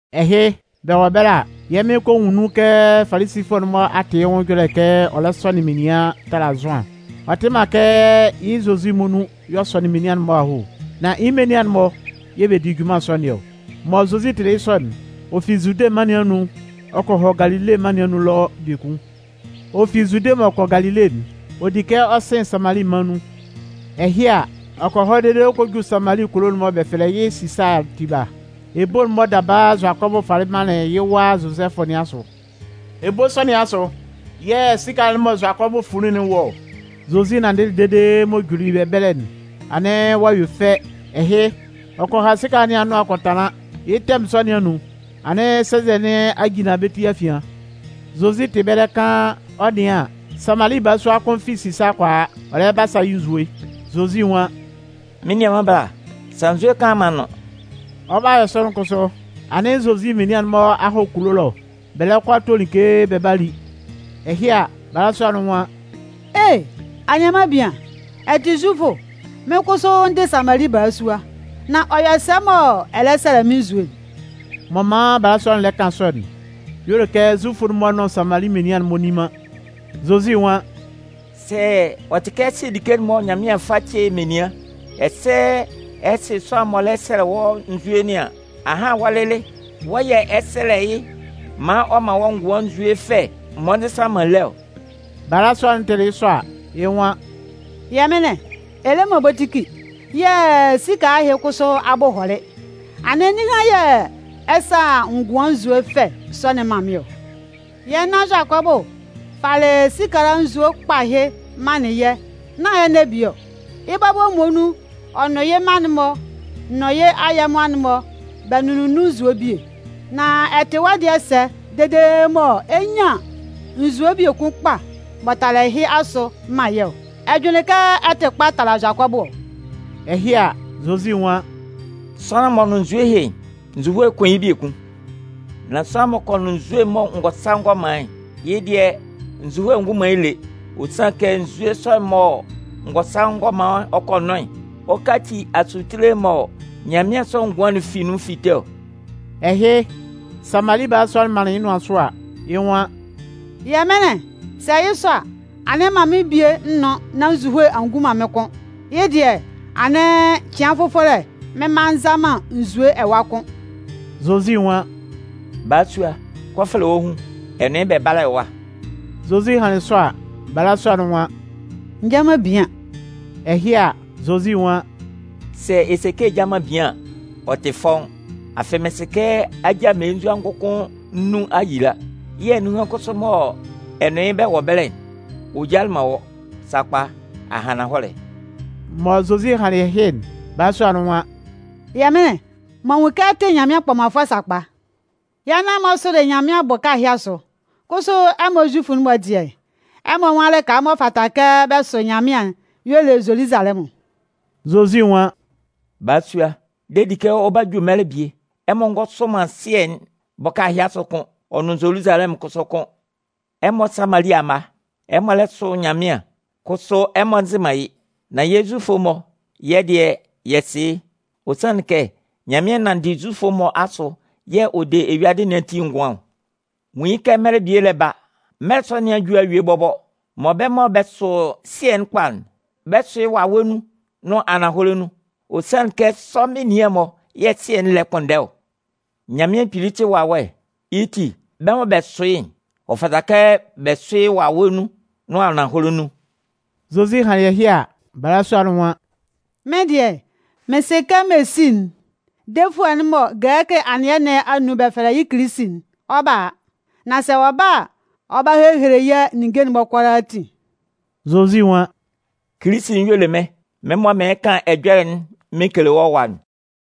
Ɛhɩ, bɛ wɔ ɛbɛlɛ a, yɛ́ Mɩn kɔ nwun nun kɛ Falisifʋɛ'n-mɔ a tɩ yɩ́ nwʋn ɛjɔlɛ kɛ ɔ lɛ sɔnɩn menian tala Zʋan. Ɔ tɩ man kɛ yɩ́ Zozi muonun y'ɔ sɔnɩn menian'n-mɔ aho, nan yɩ́ menian'n-mɔ yɛ̂ bɛ di junman sɔ nɩn ɔ. Mɔ Zozi tɩlɩ yɩ́ sɔ'n, ɔ fi Zude mân nɩn anun ɔ kɔ hɔ Galile mân nɩn anun ɛlɔ biekun. Ɔ fi Zude mɔ ɔ 'kɔ Galile'n, ɔ di kɛ ɔ sɩn Samali mân nun. Ɛhɩ a, ɔ kɔ hɔ dede ɔ kɔ ju Samali kulo'n mɔ bɛ fɛlɛ yɩ́ Sisaa'n tiba, ebo'n mɔ daba Zʋakɔbʋ falɩ manlɩn yɩ́ wa Zozɛfʋ nɩn asʋ. Ebo sɔ nɩn asʋ yɛ̂ sikala'n mɔ Zʋakɔbʋ funlin'n wɔ ɔ. Zozi nanndɩlɩ dede m'ɔ juli ɛbɛlɛ'n, anɩn ɔ'a yue fɛ. Ɛhɩ, ɔ kɔ ha sikala nɩn anʋan kɔ tanlan. Yɩ́ tɛmʋn sɔ nɩn anun, anɩn sɛnzɛ nɩn a jinlan bɛ́ ti afian. Zozi tɩ ɛbɛlɛ kaan, ɔ 'nɩan an, Samali balasua kʋn fi Sisaa kɔ a, ɔ lɛ ba a sa yɩ́ nzue. Zozi nwan: “Mɩ́n nianman bala, sa nzue kaan maan n nʋ́n.” Ɔ 'ba yɔ sɔ'n kʋsʋ, anɩn Zozi menian'n-mɔ a hɔ kulo ɛlɔ, bɛ lɛ kɔ a to like bɛ 'ba li. Ɛhɩ a, balasua'n nwan: “E! Anianman bian, ɛ tɩ Zufʋ, mɩ́n kʋsʋ n dɩ Samali balasua, nan ɔ yɔ sɛ mɔ ɛ lɛ sɛlɛ mɩ́n nzue'n?” M'ɔ man balasua'n lɛ kan sɔ'n, y'ɔ le kɛ Zufʋ'n-mɔ nʋn Samali menian'n-mɔ nni man. Zozi nwan: “Sɛ ɔ tɩ kɛ ɛ sɩ like'n mɔ Nyanmɩan fa ce menian, ɛsɛ sɛ ɛ sɩ sʋanlan'n m'ɔ lɛ sɛlɛ wɔ́ nzue nɩn an, ahan wɔ́ lɩlɩ wɔ́ yɛ̂ ɛ 'sɛlɛ yɩ́ maan ɔ man wɔ́ ngʋan nzue fɛ m'ɔ nzɩsan man lé ɔ.” Balasua'n tɩlɩ yɩ́ sɔ a, yɩ́ nwan: “Yɛmɩnlɩn, ɛ le man bokiti, yɛ̂ sikala ɛhɩ kʋsʋ abʋ hɔlɩ, anɩn ninhan yɛ̂ ɛ 'sa ngʋan nzue fɛ sɔ'n man mɩ́n ɔ? Yɛ́ nan Zʋakɔbʋ falɩ sikala nzue kpa ɛhɩ manlɩn yɛ́ nán ɛnɛ bie ɔ. Yɩ́ bɔbɔ muonun, ɔ nʋn yɩ́ mma'n-mɔ, nʋn yɩ́ ayɛmʋa'n-mɔ bɛ nʋnlɩn nun nzue'n bie. Nan ɛ tɩ wɔ́ dɩɛ sɛ dede mɔ ɛ 'nyan nzue biekun kpa m'ɔ tala ɛhɩ asʋ man yɛ́ ɔ? Ɛ jʋnlɩn kɛ ɛ tɩ kpa tala Zʋakɔbʋ ɔ?” Ɛhɩ a, Zozi nwan: “Sʋanlan m'ɔ nʋn nzue ɛhɩ'n, nzuhoe 'kun yɩ́ biekun. Nan sʋanlan m'ɔ kɔ nʋn nzue'n mɔ n gɔ sa n gɔ man yɩ́'n, yɩ́ dɩɛ, nzuhoe ngun man yɩ́ lé. Ɔ sanlɩn kɛ nzue sɔ'n mɔ n gɔ sa n gɔ man ɔ kɔ nʋn'n, ɔ 'kaci asutile mɔ nyanmɩansʋ ngʋan'n fi nun fite ɔ.” Ɛhɩ, Samali balasua'n manlɩn yɩ́ nʋan sʋ a, yɩ́ nwan: “Yɛmɩnlɩn, sɛ yɩ́ sɔ a, anɩn man mɩ́n bie n nʋ́n nán nzuhoe a ngun mɩ́n kʋ́n. Yɩ́ dɩɛ anɩn cɩan fʋfɔlɛ mɩn mma nza man nzue ɛwa kʋ́n.” Zozi nwan: “Balasua, kɔ fɛlɛ wɔ́ hun, ɛ nʋn yɩ́ bɛ bála ɛwa.” Zozi hanlɩn sɔ a, balasua'n nwan: “N nja man bian.” Ɛhɩ a, Zozi nwan: “Sɛ ɛ se kɛ ɛ ja man bian an, ɔ tɩ fɔ́ʋ́n. Afɩ mɩ́n sɩ kɛ a ja mmelenzua ngʋkʋn nnun a yila, yɛ̂ nunhan'n kʋsʋ mɔ ɛ nʋn yɩ́ bɛ wɔ ɛbɛlɛ'n, ɔ jalɩ man wɔ́. Sakpa, a han ananhɔlɛ.” Mɔ Zozi hanlɩn ɛhɩ'n, balasua'n nwan: “Yɛmɩnlɩn, m'an nwun kɛ ɛ tɩ Nyanmɩan kpɔmanfʋɛ sakpa. Yɛ́ nan-mɔ sʋlɩ Nyanmɩan bʋka ɛhɩ asʋ, kʋsʋ ɛmɔ Zufʋ'n-mɔ dɩɛ, ɛmɔ nwan lɩka m'ɔ fata kɛ bɛ sʋ Nyanmɩan'n y'ɔ le Zoluzalɛmʋn.” Zozi nwan: “Balasua, de di kɛ ɔ 'ba ju mɛlɛ bie, ɛmɔ ngɔ sʋ man Sɩɛ'n bʋka ɛhɩ asʋ kʋ́n, ɔ nʋn Zoluzalɛmʋn kʋsʋ kʋ́n. Ɛmɔ Samali amma, ɛmɔ lɛ sʋ Nyanmɩan, kʋsʋ ɛmɔ nzɩ man yɩ́. Nan yɛ́ Zufʋ'n-mɔ, yɛ́ dɩɛ, yɛ sɩ yɩ́. Ɔ sanlɩn kɛ Nyanmɩan nanndɩ Zufʋ'n-mɔ asʋ yɛ̂ ɔ de eyuadɩ nɩn ati ngʋan ɔ. Nwun yɩ́ kɛ mɛlɛ bie lɛ ba, mɛlɛ sɔ nɩn a ju a yue bɔbɔ, mɔ bɛ́ mɔ bɛ sʋ Sɩɛ'n kpa'n, bɛ 'sʋ yɩ́ wawɛ nun nʋn ananhɔlɛ nun. Ɔ sanlɩn kɛ sɔ menian'n-mɔ yɛ̂ Sɩɛ'n lɛ kpʋnndɛ ɔ. Nyanmɩan Kpili tɩ wawɛ. Yɩ́ ti, bɛ́ mɔ bɛ sʋ yɩ́'n, ɔ fata kɛ bɛ sʋ yɩ́ wawɛ nun nʋn ananhɔlɛ nun.” Zozi hanlɩn ɛhɩ a, balasua'n nwan: “Mɩ́n dɩɛ, mɩn sɩ kɛ Mesi'n, (defʋɛ'n mɔ gɛlɛkɩ anɩɛ nɩn anun bɛ fɛlɛ yɩ́ Kilisi'n), ɔ 'ba a. Nan sɛ ɔ ba a, ɔ 'ba hehele yɛ́ ninnge'n kʋalaatin.” Zozi nwan: “Kilisi'n y'ɔ le mɩ́n, mɩ́n mɔ mɩɩn kan ɛjɔlɛ'n mɩn kele wɔ́ ɛwa'n.”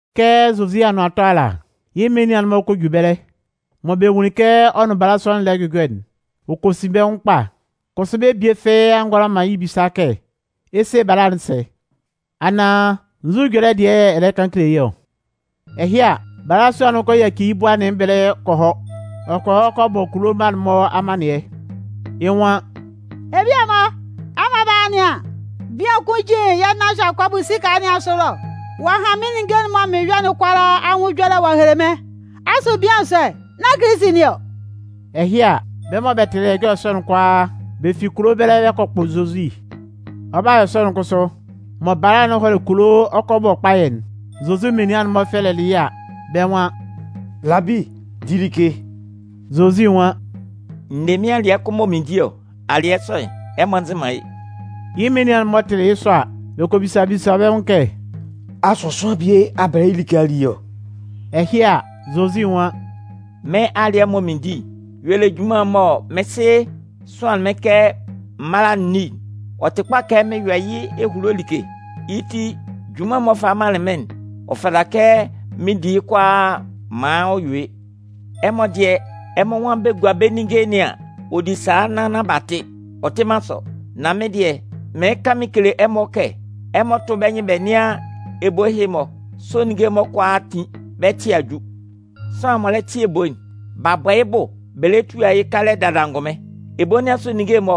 Kɛ Zozi anʋan 'tɔ ala, yɩ́ menian'n-mɔ kɔ ju ɛbɛlɛ. Mɔ bɛ nwunlin kɛ ɔ nʋn balasua'n lɛ jʋjɔ'n, ɔ kɔ sin bɛ́ nwʋn kpa. Kʋsʋ bɛ́ bie fɩ́ɩ́ a ngʋala man yɩ́ bisa kɛ: “Ɛ 'se bala'n sɛ?” Anaan: “Nzu ɛjɔlɛ dɩɛ yɛ̂ ɛ lɛ kan kele yɩ́ ɔ?” Ɛhɩ a, balasua'n kɔ yaci yɩ́ bua nɩn ɛbɛlɛ ɔ kɔ hɔ kulo. Ɔ kɔ hɔ kɔ bɔ kulo mma'n-mɔ amannɩɛ. Yɩ́ nwan: “Ebia-mɔ, ɛmɔ bála a nɩan, bian kʋn jin yɛ́ nan Zʋakɔbʋ sikala nɩn asʋ ɛlɔ. Ɔ'a han mɩ́n ninnge'n mɔ mɩn yɔ'n kʋalaa anwʋn ɛjɔlɛ ɔ'a hele mɩ́n. Asʋ bian sɔ'n, nán Kilisi nɩn ɔ?” Ɛhɩ a, bɛ́ mɔ bɛ tɩlɩ ɛjɔlɛ sɔ'n kʋalaa, bɛ fi kulo ɛbɛlɛ bɛ kɔ kpʋ Zozi. Ɔ 'ba yɔ sɔ'n kʋsʋ, mɔ bala'n hɔlɩ kulo ɔ 'kɔ a bɔ kpayɛ'n, Zozi menian'n-mɔ fɛlɛlɩ yɩ́ a, bɛ́ nwan: “Labi, di like!” Zozi nwan: “N ne mɩ́n alɩɛ kʋn mɔ mɩn di ɔ, alɩɛ sɔ'n, ɛmɔ nzɩ man yɩ́.” Yɩ́ menian'n-mɔ tɩlɩ yɩ́ sɔ a, bɛ kɔ bisa bisa bɛ́ nwʋn kɛ: “Asʋ sʋanlan bie a bɛlɛ yɩ́ like a li ɔ?” Ɛhɩ a, Zozi nwan: “Mɩ́n alɩɛ'n mɔ mɩn di'n y'ɔ le junman'n mɔ mɩ́n Sɩ sʋanlɩn mɩ́n kɛ m mála n ní'n. Ɔ tɩ kpa kɛ mɩn yɔ yɩ́ ehulo like, yɩ́ ti, junman'n m'ɔ falɩ manlɩn mɩ́n'n, ɔ fata kɛ mɩn di yɩ́ kʋalaa maan ɔ yue. Ɛmɔ dɩɛ, ɛmɔ nwan bɛ gua bɛ́ ninnge nɩn an, ɔ di sala nnan nán b'a tɩ. Ɔ tɩ man sɔ? Nan mɩ́n dɩɛ, mɩɩn kan mɩn kele ɛmɔ kɛ ɛmɔ tʋ́ bɛ́ nyɩn bɛ nɩ́an ebo ɛhɩ-mɔ, sʋ ninnge'n-mɔ kʋalaa a tin, bɛ́ ɛtɩɛ a ju. Sʋanlan'n m'ɔ lɛ tɩ ebo'n, b'a bɔ yɩ́ bʋ bɛ lɛ tua yɩ́ kalɛ dada angʋnmɩn. Ebo nɩn asʋ ninnge'n mɔ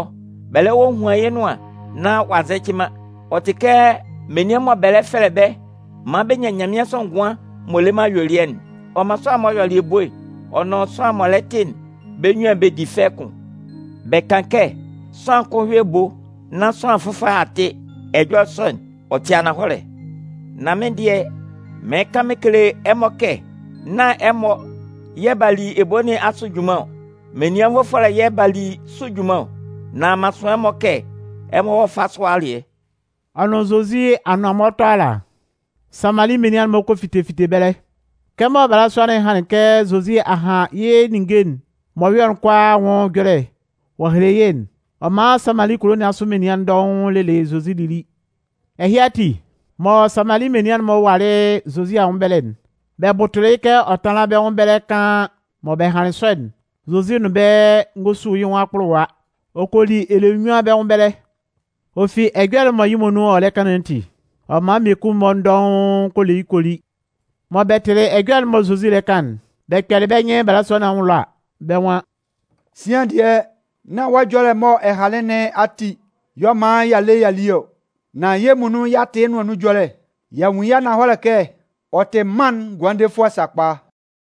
bɛ lɛ hohuan yɩ́ nʋan nán ɔ'a nzɛcɩ man'n, ɔ tɩ kɛ menian mɔ bɛ lɛ fɛlɛ bɛ́ maan bɛ nyan nyanmɩansʋ ngʋan m'ɔ le man ayuelɩɛ'n. Ɔ man sʋanlan'n m'ɔ yɔlɩ ebo'n, ɔ nʋn sʋanlan'n m'ɔ lɛ tɩ'n, bɛ́ munnyuan bɛ di fɛ kʋn. Bɛ kan kɛ: ‘Sʋanlan kʋn yɔ ebo nán sʋanlan fʋfɔlɛ a tɩ.’ Ɛjɔlɛ sɔ'n, ɔ tɩ ananhɔlɛ. Nan mɩ́n dɩɛ, mɩɩn kan mɩn kele ɛmɔ kɛ, nán ɛmɔ yɛ̂ b'a li ebo nɩn asʋ junman ɔ, menian nvʋfɔlɛ yɛ̂ b'a li sʋ junman ɔ. Nan m'an sʋan ɛmɔ kɛ ɛmɔ hɔ́ fá sʋ alɩɛ.” Ɔ nʋn Zozi anʋan mɔ ɔ 'tɔ ala, Samali menian'n-mɔ kɔ fite fite ɛbɛlɛ. Kɛmɔ balasua'n hanlɩn kɛ Zozi a han yɩ́ ninnge'n m'ɔ yɔ'n kʋalaa anwʋn ɛjɔlɛ ɔ a hele yɩ́'n, ɔ man Samali kulo nɩn asʋ menian dɔʋn lelɩ Zozi lili. Ɛhɩ ati, mɔ Samali menian'n-mɔ walɩ Zozi anwʋn ɛbɛlɛ'n, bɛ bʋtʋlɩ yɩ́ kɛ ɔ tánlan bɛ́ nwʋn ɛbɛlɛ kaan. Mɔ bɛ hanlɩn sɔ'n, Zozi nʋn bɛ́ ngɔ su yɩ́ nwʋn akpʋlʋwa, ɔ kɔ li ɛlɛ nnyuan bɛ́ nwʋn ɛbɛlɛ. Ɔ fi ɛjɔlɛ'n mɔ yɩ́ muonun ɔ lɛ kan nɩn ati, ɔ man mmiekun-mɔ dɔʋn kɔ le yɩ́ kɔ li. Mɔ bɛ tɩlɩ ɛjɔlɛ'n mɔ Zozi lɛ kan'n, bɛ kpɛlɩ bɛ́ nyɩn balasua nɩn anwʋn ɛlɔ a, bɛ́ nwan: “Sian dɩɛ, nán wɔ́ ɛjɔlɛ'n mɔ ɛ hanlɩn nɩn ati y'ɔ man y'a le y'a li ɔ, nan yɛ́ muonun y'a tɩ yɩ́ nʋan nun ɛjɔlɛ. Y'a nwun yɩ́ ananhɔlɛ kɛ ɔ tɩ mân'n Ngʋandefʋɛ sakpa.”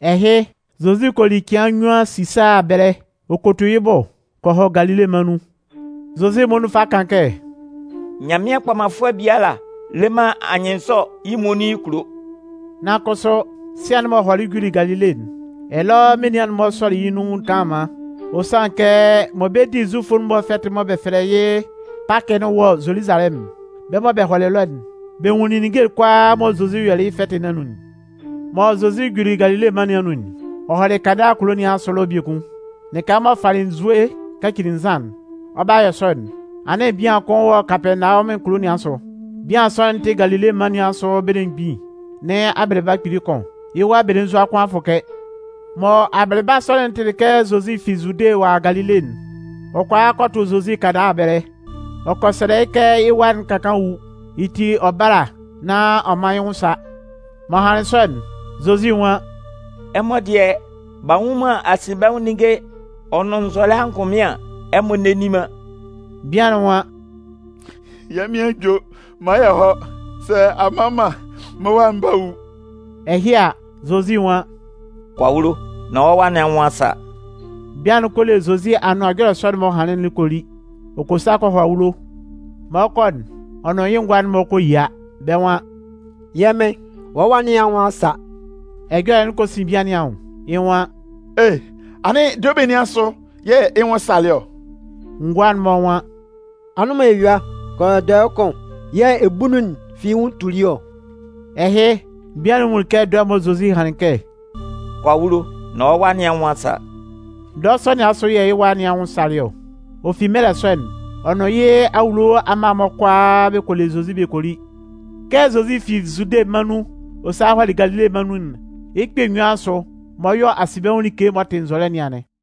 Ɛhɩ, Zozi kɔ li cɩan nnyuan Sisaa ɛbɛlɛ, ɔ kɔ tu yɩ́ bʋ kɔ hɔ Galile mân nun. Zozi muonun fa kan kɛ, “Nyanmɩan kpɔmanfʋɛ biala le man anyɩnnzɔ yɩ́ muonun yɩ́ kulo.” Nan kʋsʋ, sian'n m'ɔ hɔlɩ juli Galile'n, ɛlɔ menian'n-mɔ sɔlɩ yɩ́ nun kanlanman. Ɔ sanlɩn kɛ mɔ bɛ 'di Zufʋ'n-mɔ fɛtɩ'n mɔ bɛ fɛlɛ yɩ́ Pakɩ'n wɔ Zoluzalɛmʋn'n, bɛ́ mɔ bɛ hɔlɩ ɛlɔ'n, bɛ nwunlin ninnge'n kʋalaa mɔ Zozi yɔlɩ yɩ́ fɛtɩ nɩn anun'n. Mɔ Zozi juli Galile mân nɩn anun'n, ɔ hɔlɩ Kana kulo nɩn asʋ ɛlɔ biekun, lɩka m'ɔ falɩ nzue kacili nzan'n. Ɔ 'ba yɔ sɔ'n, anɩn bian kʋn wɔ Kapɛɛnawɔmʋn kulo nɩn asʋ. Bian sɔ'n tɩ Galile mân nɩn asʋ belemgbin nɩn abɩlɩba kpili kʋn. Yɩ́ wa belenzua kʋn a fʋkɛ. Mɔ abɩlɩba sɔ'n tɩlɩ kɛ Zozi fi Zude ɔ'a a Galile'n, ɔ kɔ a kɔ tʋ Zozi Kana ɛbɛlɛ. Ɔ kɔ sɛlɛ yɩ́ kɛ yɩ́ wa'n ka kaan wu, yɩ́ ti ɔ bála nán ɔ mán yɩ́ nwʋn sá. M'ɔ hanlɩn sɔ'n, Zozi nwan: “Ɛmɔ dɩɛ b'a nnwun man asinbɛnwʋn ninnge ɔ nʋn nzɔlɛ angʋnmɩn an, ɛmɔ nne nni man.” Bian'n nwan: “Yɛ́ Mɩn ajo! Man yɛ hɔ́, sɛ a mma man an, mɩ́n wa'n 'ba wu.” Ɛhɩ a, Zozi nwan: “Kɔ awulo! Nán wɔ́ wa nɩn anwʋn a sa.” Bian'n kɔ le Zozi anʋan ɛjɔlɛ sɔ'n m'ɔ hanlɩn'n kɔ li. Ɔ kɔ sa kɔ hɔ awulo. Mɔ ɔ 'kɔ'n, ɔ nʋn yɩ́ ngʋa'n-mɔ kɔ yia. Bɛ́ nwan: “Yɛ́ mɩn, wɔ́ wa nɩn anwʋn a sa!” Ɛjɔlɛ'n kɔ sin bian nɩn anwʋn, yɩ́ nwan: “E! Anɩn dɔɛ benin asʋ yɛ̂ yɩ́ nwʋn salɩ ɔ?” Ngʋa'n-mɔ nwan: “Anʋ́nman eyua kɔ yɔ dɔɛ kʋn yɛ̂ ebunnun'n fi yɩ́ nwʋn tuli ɔ.” Ɛhɩ, bian'n nwunlin kɛ dɔɛ'n mɔ Zozi hanlɩn kɛ: “Kɔ awulo nán wɔ́ wa nɩn anwʋn a sa.” Dɔɛ sɔ nɩn asʋ yɛ̂ yɩ́ wa nɩn anwʋn salɩ ɔ. Ɔ fi mɛlɛ sɔ'n, ɔ nʋn yɩ́ awulo amma'n-mɔ kʋalaa bɛ kɔ le Zozi bɛ kɔ li. Kɛ Zozi fi Zude mân nun ɔ salɩ walɩ Galile mân nun'n, yɩ́ kpɛ̂ nnyuan asʋ m'ɔ yɔ asinbɛnwʋn like m'ɔ tɩ nzɔlɛ nɩn anɩn.